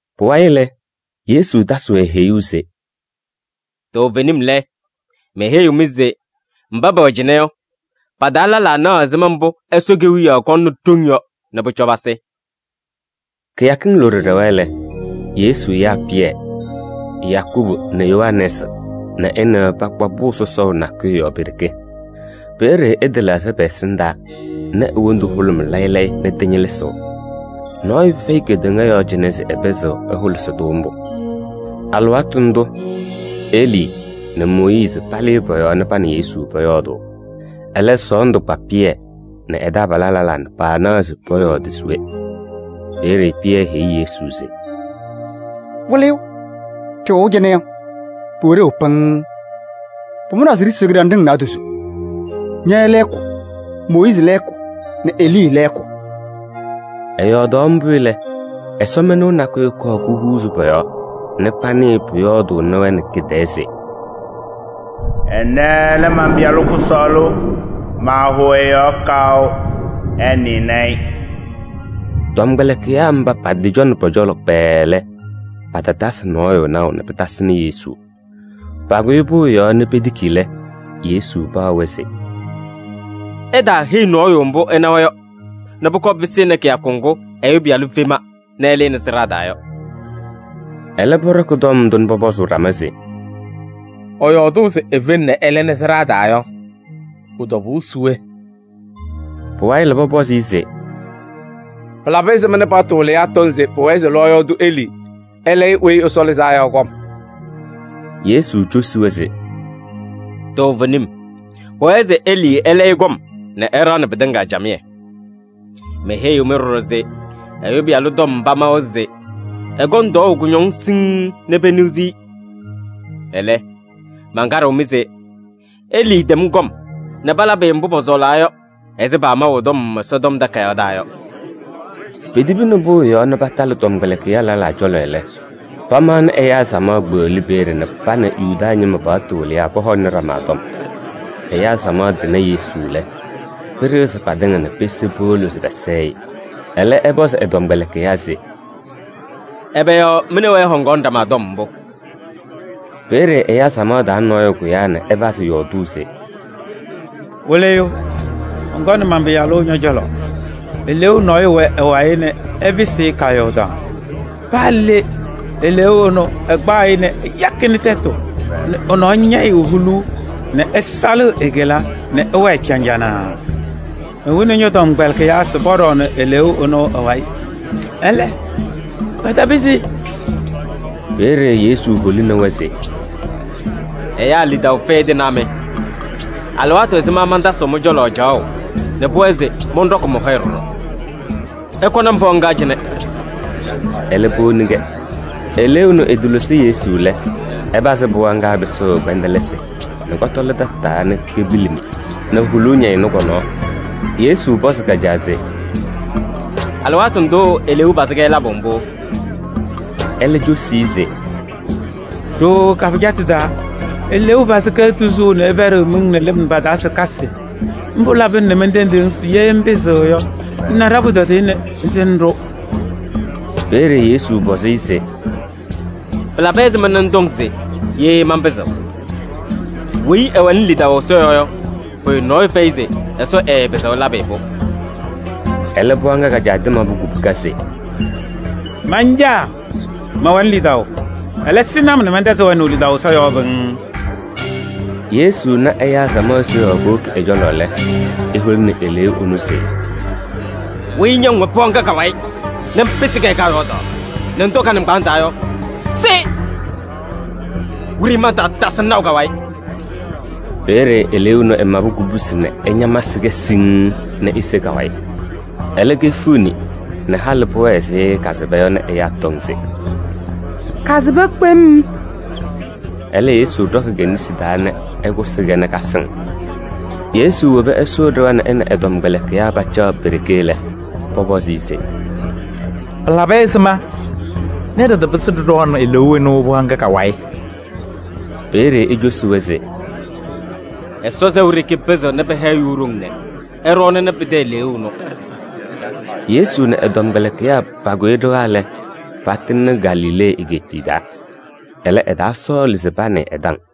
Pʋwayɩ lɛ, Yesu tasɩ-wɛ heyuu se: “Toovenim lɛ, meheyiɣ-mɩ se mba pɛwɛ cɩnɛ yɔ, pa-taa lɛlaa naɣ ɛzɩma mbʋ Ɛsɔ Kewiyaɣ kɔŋnɩ ɖoŋ yɔ nɛ pʋcɔ pasɩ.” Kɩyakɩŋ loɖo ɖɛwa lɛ, Yesu yaa Pɩyɛ nɛ Yakubu nɛ Yohanɛɛsɩ nɛ ɛ nɛ wɛ pakpa pʋʋ sɔsɔʋ nakʋyʋ yɔɔ pe-ɖeke. Peeye ɛtɩlɛɣzɩ pɛ-ɛsɩndaa nɛ e-wondu hʋlʋmɩ layɩ layɩ nɛ tɩñɩlɩzɩɣ. Nɔɔyʋ fɛyɩ kedeŋa yɔɔ cɩnɛ se ɛpɩzɩɣ ɛhʋlɩsɩ-tʋ mbʋ. Alɩwaatʋ ndʋʋ Elii nɛ Mooyiizi palɩ pɔ-yɔɔ nɛ pa nɛ Yesu pɔyɔɔdʋʋ. Ɛlɛ, sɔɔndʋ kpa Pɩyɛ nɛ ɛ-taabalaa lɛlaa nɛ paanaɣ se pɔyɔɔdɩ se we. Peeye Pɩyɛ heyi Yesu se: “Wɩlɩyʋ! Ɖɩwɛʋ cɩnɛ yɔ, pʋwɛ ɖeu pɩŋŋ. Pʋmʋnaa se ɖisiɣ kɩɖanɖɩŋ naadozo: ña lɛɛkʋ, Mooyiizi lɛɛkʋ nɛ Elii lɛɛkʋ.” Ɛyɔɔdaɣ mbʋ lɛ, ɛsɔmɩnʋʋ nakʋyʋ kɔɔ kuhuuzi pɔ-yɔɔ nɛ panɩɩ pʋyɔɔdʋʋnɩ-wɛ nɛ kɩ-tɛɛ se: “Ɛnɛ lɛ man-Pɩyalʋ kʋsɔɔlʋ, maahʋʋ ɛ-yɔɔ kaʋ. Ɩnɩnɩ-ɩ.” Tɔmkpɛlɩkɩyaa mba patɩcɔnɩ pɔ-cɔlɔ kpɛɛɛ lɛ, patatasɩ nɔɔyʋ naʋ nɛ pɩtasɩnɩ Yesu. Pakʋyɩ pʋʋ yɔɔ nɛ petiki lɛ, Yesu paɣ-wɛ se: “Ɩtaaheyi nɔɔyʋ mbʋ ɩnawa yɔ nɛ pʋkɔɔ pɩsɩnɩ kɩyakʋ ŋgʋ Ɛyʋ Pɩyalʋ fema nɛ ɛlɩnɩ sɩɖaa taa yɔ.” Ɛlɛ pɔɖɔkɩ tɔm ndʋ nɛ pɔpɔzʋʋ ɖama se: “Ɛyɔɔdʋʋ se efeŋ nɛ ɛlɩnɩ sɩɖaa taa yɔ, pʋ-tɔbʋʋ se we?” Pʋwayɩ lɛ, pɔpɔzɩ-ɩ se: “Pɩlabɩ ɛzɩma nɛ paɣtʋ wɩlɩyaa tɔŋ se pʋwɛɛ se lɔɔyaɣ tʋ Elii ɛlayɩ Weyi Ɛsɔ Lɩzaa Yɔ kɔm?” Yesu cosi-wɛ se: “Toovenim, pʋwɛɛ se Elii ɛlayɩ kɔm nɛ ɛɖaɣnɩ pɩtɩŋa camɩyɛ. Meheyiɣ-mɩ ɖɔɖɔ se Ɛyʋ Pɩyalʋ tɔm pamawa se ɛkɔŋ tɔɔʋ kʋñɔŋ siŋŋ nɛ peniɣzi-i. Ɛlɛ, mankaɖɩɣ-mɩ se Elii tɛm kɔm nɛ palabɩ-ɩ mbʋ pɔsɔɔlaa yɔ ɛzɩ paamaʋ ɛ-tɔm Ɛsɔtɔm Takayaɣ taa yɔ.” Petibini pʋʋ yɔɔ nɛ patalɩ tɔmkpɛlɩkɩyaa lɛlaa cɔlɔ lɛ, pamaɣnɩ ɛyaa samaɣ kpeɣli peeye nɛ pa nɛ Yuda ñɩma paɣtʋ wɩlɩyaa pɔhɔŋnɩ ɖama tɔm. Ɛyaa samaɣ tɩna Yesu lɛ, pɩɖɩɣzɩ patɩŋa nɛ pese powolo se pɛsɛɛ-ɩ. Ɛlɛ, ɛpɔzɩ ɛ-tɔmkpɛlɩkɩyaa se: “Ɛbɛ yɔɔ mɩ nɛ wɛ ɩhɔŋaɣnɩ ɖama tɔm mbʋ?” Peeye ɛyaa samaɣ taa nɔɔyʋ kʋyaa nɛ ɛpazɩ yɔɔdʋʋ se: “Wɩlɩyʋ, mɔnkɔnɩ man-pɩyalʋ ñɔ-cɔlɔ, eleeu nɔɔyʋ wɛ ɛ-wayɩ nɛ ɛpɩsɩ-ɩ kaayɔɔdaɣ. Paa le, eleeu ɛnʋ ɛkpaɣ-ɩ nɛ ɛyakɩnɩ tɛtʋ nɛ ɛ-nɔɔ ñɛyɩɣ huluu nɛ ɛsalɩɣ e-kela nɛ ɛwɛɛ caŋjanaa. Mewini ñɔ-tɔmkpɛlɩkɩyaa se pɔɖɔɔnɩ eleeu ɛnʋ ɛ-wayɩ, ɛlɛ, patapɩzɩ.” Peeye Yesu holini-wɛ se: “Ɛyaa lidaʋ fɛyɩ tɩnaa mɩ! Alɩwaatʋ ɛzɩma mantasɩɣ mɩ-cɔlɔ caɣʋ nɛ pʋwɛɛ se mɔnɖɔkɩ mɔ-hɔyɛ ɖɔɖɔ? Ɩkɔnɩ-m pɩɣa ŋga cɩnɛ!” Ɛlɛ powoni-kɛ. Eleeu ɛnʋ ɛtɩlosi Yesu lɛ, ɛpazɩ pɩɣa ŋga pɩsʋʋ kpɛndɛlɩsɩ nɛ kɔtɔlɩ tataa nɛ kepilimi nɛ huluu ñɛyɩ kɔ-nɔɔ. Yesu pɔzɩ ka-caa se: “Alɩwaatʋ ndʋʋ eleeu pazɩ-kɛ labʋ mbʋ?” Ɛlɛ cosi-i se: “Ɖooo ka-pɩjatʋ taa eleeu pazɩ-kɛ tuzuu nɛ ɛpɛɖɩɣ miŋ nɛ lɩm pa-taa se kasɩ. Mbʋ labɩna nɛ mentendiɣ-ŋ se ye ŋpɩzɩɣ yɔ, ŋna ɖa-pʋtɔdɩyɛ nɛ ŋsɩnɩ-ɖʋ.” Peeye Yesu pɔzɩ-ɩ se: “Pɩlabɩ ɛzɩma nɛ ŋtɔŋ se ye manpɩzɩɣ? Weyi ɛwɛnɩ lidaʋ Ɛsɔ yɔɔ yɔ, pʋyʋ nɔɔyʋ fɛyɩ se Ɛsɔ ɛɛpɩzɩɣ ɛlabɩ-ɩ-pʋ.” Ɛlɛ pɩɣa ŋga ka-caa tɩmabʋ kubuka se: “Man-caa mɛwɛnɩ lidaʋ, ɛlɛ sɩnɩ-m nɛ mɛntɛzɩ wɛnaʋ lidaʋ Ɛsɔ yɔɔ pɩŋŋ.” Yesu na ɛyaa samaɣ seɣaɣ powoki ɛ-cɔlɔ lɛ, eholini eleeu ɛnʋ se: “Weyi ña ŋwɛ pɩɣa ŋga ka-wayɩ nɛ ŋpɩsɩ-kɛ kaayɔɔdaɣ nɛ ŋtɔ ka-nɩŋgbaaŋ taa yɔ, se! Wiɖiyi mantaatasɩ-ŋ naʋ ka-wayɩ.” Peeye eleeu ɛnʋ ɛmabɩ kubusi nɛ ɛñamsɩ-kɛ siŋŋ nɛ ese ka-wayɩ. Ɛlɛ kefiɣni nɛ halɩ pʋwɛɛ ɛzɩ kasɩba yɔ nɛ ɛyaa tɔŋ se: “Kasɩba kpem.” Ɛlɛ, Yesu ɖɔkɩ ke-nesi taa nɛ ɛkʋsɩ-kɛ nɛ kasɩŋ. Yesu wobi ɛsʋʋ ɖɩɣa nɛ ɛ nɛ ɛ-tɔmkpɛlɩkɩyaa pacaɣ pe-ɖeke lɛ, pɔpɔzɩ-ɩ se: “Pɩlabɩ ɛzɩma nɛ ɖɩtapɩzɩ ɖɩɖɔɔnɩ eleeu ɛnʋ pɩɣa ŋga ka-wayɩ?” Peeye ecosi-wɛ se: “Ɛsɔ sɛʋ ɖeke pɩzɩɣnɩ pɩha ɛyʋ ɖoŋ nɛ ɛɖɔɔnɩnɩ pɩtɛ eleeu ɛnʋ.” Yesu nɛ ɛ-tɔmkpɛlɩkɩyaa pakʋyɩ ɖɩɣa lɛ, patɩŋnɩ Galilee egeetiye taa. Ɛlɛ, ɛtaasɔɔlɩ se panɩɩ ɛ-taŋ.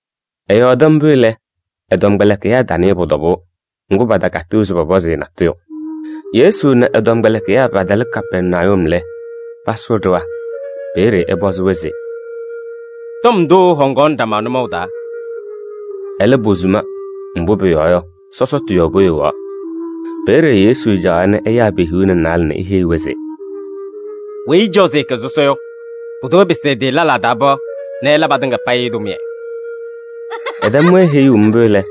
Ɛyɔɔdɩ mbʋ lɛ, ɛ-tɔmkpɛlɩkɩyaa tanɩɩ pʋ-tɔbʋʋ. Ŋgʋ, patakatɩɣ se pɔpɔzɩ-ɩ natʋyʋ. Yesu nɛ ɛ-tɔmkpɛlɩkɩyaa patalɩ Kapɛrnayum lɛ, pasʋʋ ɖɩɣa. Peeye ɛpɔzɩ-wɛ se: “Tɔm ndʋ ɩhɔŋaɣnɩ ɖama nʋmɔʋ taa?” Ɛlɛ, posuma, mbʋ pʋyɔɔ yɔ, sɔsɔtʋ yɔɔ poyowaɣ. Peeye Yesu caɣaɣ nɛ ɛyaa pe-hiu nɛ naalɛ nɛ eheyi-wɛ se: “Weyi ɛcaɣ se ɛkɛ sɔsɔ yɔ, pʋdʋ ɛpɩsɩ ɛ-tɩ lɛlaa taa pɩɣa nɛ ɛla patɩŋa payɩ tʋmɩyɛ.” Ɛtɛm-wɛ heyuu mbʋ lɛ,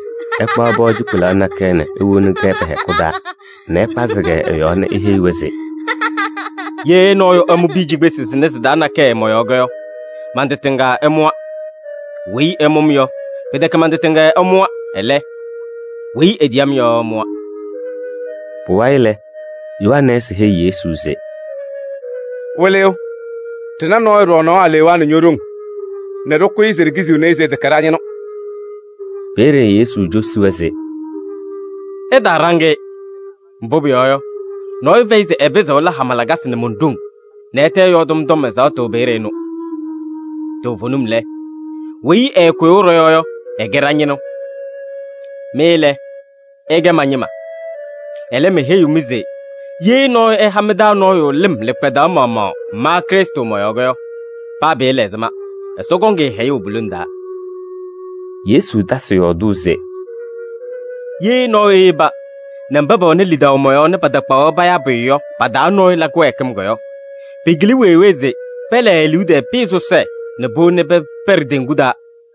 ɛkpaɣ pɩɣa cikpelaɣ nakɛyɛ nɛ ewoni-kɛ pɛ-hɛkʋ taa nɛ ɛkpazɩ-kɛ ɛ-yɔɔ nɛ eheyi-wɛ se: “Ye nɔɔyʋ ɛmʋ piya cikpesi sɩnɛ sɩ-taa nakɛyɛ mɔ-yɔɔ yɔ, man-tɩ tɩŋa ɛmʋwa. Weyi ɛmʋ-m yɔ, pɩtɛkɛ man-tɩ tɩŋa ɛmʋwa, ɛlɛ, weyi etiyi-m yɔ ɛmʋwa.” Pʋwayɩ lɛ, Yohanɛɛsɩ heyi Yesu se: “Wɩlɩyʋ, ɖɩna nɔɔyʋ ɖɔɔnaɣ alewaa nɛ ño-ɖoŋ nɛ ɖɩkʋyɩ se ɖikiziɣni-i se ɛtɛkɛ ɖa-ñɩnʋ.” Peeye Yesu cosi-wɛ se: “Ɩtaaɖaŋ-ɩ, mbʋ pʋyɔɔ yɔ, nɔɔyʋ fɛyɩ se ɛpɩzɩɣ ɛla hama lakasɩ nɛ mon-ɖoŋ nɛ ɛtɛ ɛyɔɔdɩ-m tɔm ɛzaɣtʋ peeye ɛnʋ. Toovenim lɛ, weyi ɛɛkʋyʋʋ ɖɔ-yɔɔ yɔ, ɛkɛ ɖa-ñɩnʋ. Mɩ lɛ, ɩkɛ ma-ñɩma. Ɛlɛ, meheyiɣ-mɩ se ye nɔɔyʋ ɛha mɩ-taa nɔɔyʋ lɩm lɩkpadaɣ maɣmaɣ ma Krɩstʋ mɔ-yɔɔ yɔ, paa pɩɩla ɛzɩma, Ɛsɔ kɔŋ-ɩ hɛyʋʋ pu-lone taa.” Yesu tasɩ yɔɔdʋʋ se: “Ye nɔɔyʋ eyeba nɛ mba pɛwɛnɩ lidaʋ mɔ-yɔɔ nɛ patakpaɣ-wɛ payaa pʋyʋ yɔ pa-taa nɔɔyʋ la kɩwɛɛkɩm yɔ, pɩkɩlɩ weewee se pɛlɛɛ e-liu tɛɛ pɩyɛ sɔsɔɖɛ nɛ powoni pɛpɛɖɩ teŋgu taa.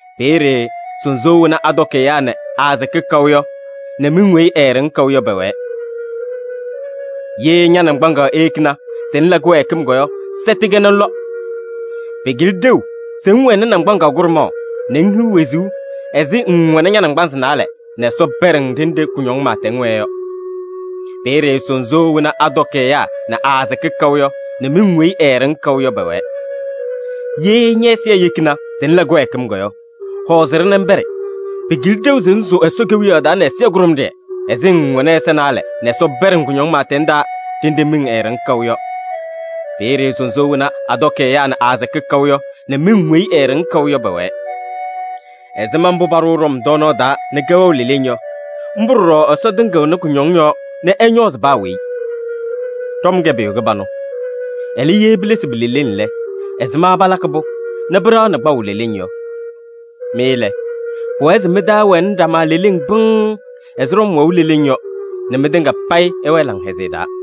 Peeye ‘sunzuuwee wena atɔkɩ ɛyaa nɛ aasɩkɩ kaʋ yɔ nɛ miŋ weyi eeɖeŋ kaʋ yɔ pɛwɛɛ.’] Ye ña-naŋgbaŋaɣ eyekini se ŋla kɩwɛɛkɩm yɔ, sɛtɩ-kɛ nɛ ŋlɔ. Pɩkɩlɩ ɖeu se ŋwɛnɩ naŋgbaŋaɣ kʋɖʋmaɣ nɛ ŋhiɣ wezuu ɛzɩ ŋŋwɛnɩ ña-naŋgbanzɩ naalɛ nɛ Ɛsɔ pɛɖɩ-ŋ ɖenɖe kʋñɔŋ pɩɩtɛŋ wɛɛ yɔ. [ Peeye ‘sunzuuwee wena atɔkɩ ɛyaa nɛ aasɩkɩ kaʋ yɔ nɛ miŋ weyi eeɖeŋ kaʋ yɔ pɛwɛɛ.’] Ye ñɛ-ɛzɩyɛ eyekini se ŋla kɩwɛɛkɩm yɔ, hɔɔzɩ-ɖɩ nɛ ŋpɛɖɩ. Pɩkɩlɩ ɖeu se ŋsʋʋ Ɛsɔ Kewiyaɣ taa nɛ ɛzɩyɛ kʋɖʋmɖɩyɛ ɛzɩ ŋŋwɛnɩ ɛza naalɛ nɛ Ɛsɔ pɛɖɩ-ŋ kʋñɔŋ pɩɩtɛŋ taa ɖenɖe miŋ eeɖeŋ kaʋ yɔ. Peeye ‘sunzuuwee wena atɔkɩ ɛyaa nɛ aasɩkɩ kaʋ yɔ nɛ miŋ weyi eeɖeŋ kaʋ yɔ pɛwɛɛ.’ “Ɛzɩma mbʋ paɖʋʋ ɖɔm tɔɔnaɣ taa nɛ kɛwɛɣ leleŋ yɔ, mbʋ ɖɔɖɔ Ɛsɔ tɩŋɩɣnɩ kʋñɔŋ yɔɔ nɛ ɛñɔɔzɩ paa weyi. “Ɖɔm kɛ pʋyʋ kɩbanʋ. Ɛlɛ, ye pilesi pi-leleŋ lɛ, ɛzɩma palakɩ-pʋ nɛ pɩɖaɣnɩ kpaʋ leleŋ yɔ? Mɩ lɛ, pʋwɛɛ se mɩ-taa ɛwɛnɩ ɖama leleŋ pɩŋŋ ɛzɩ ɖɔm wɛʋ leleŋ yɔ nɛ mɩtɩŋa payɩ ɩwɛɛ laŋhɛzɩyɛ taa.”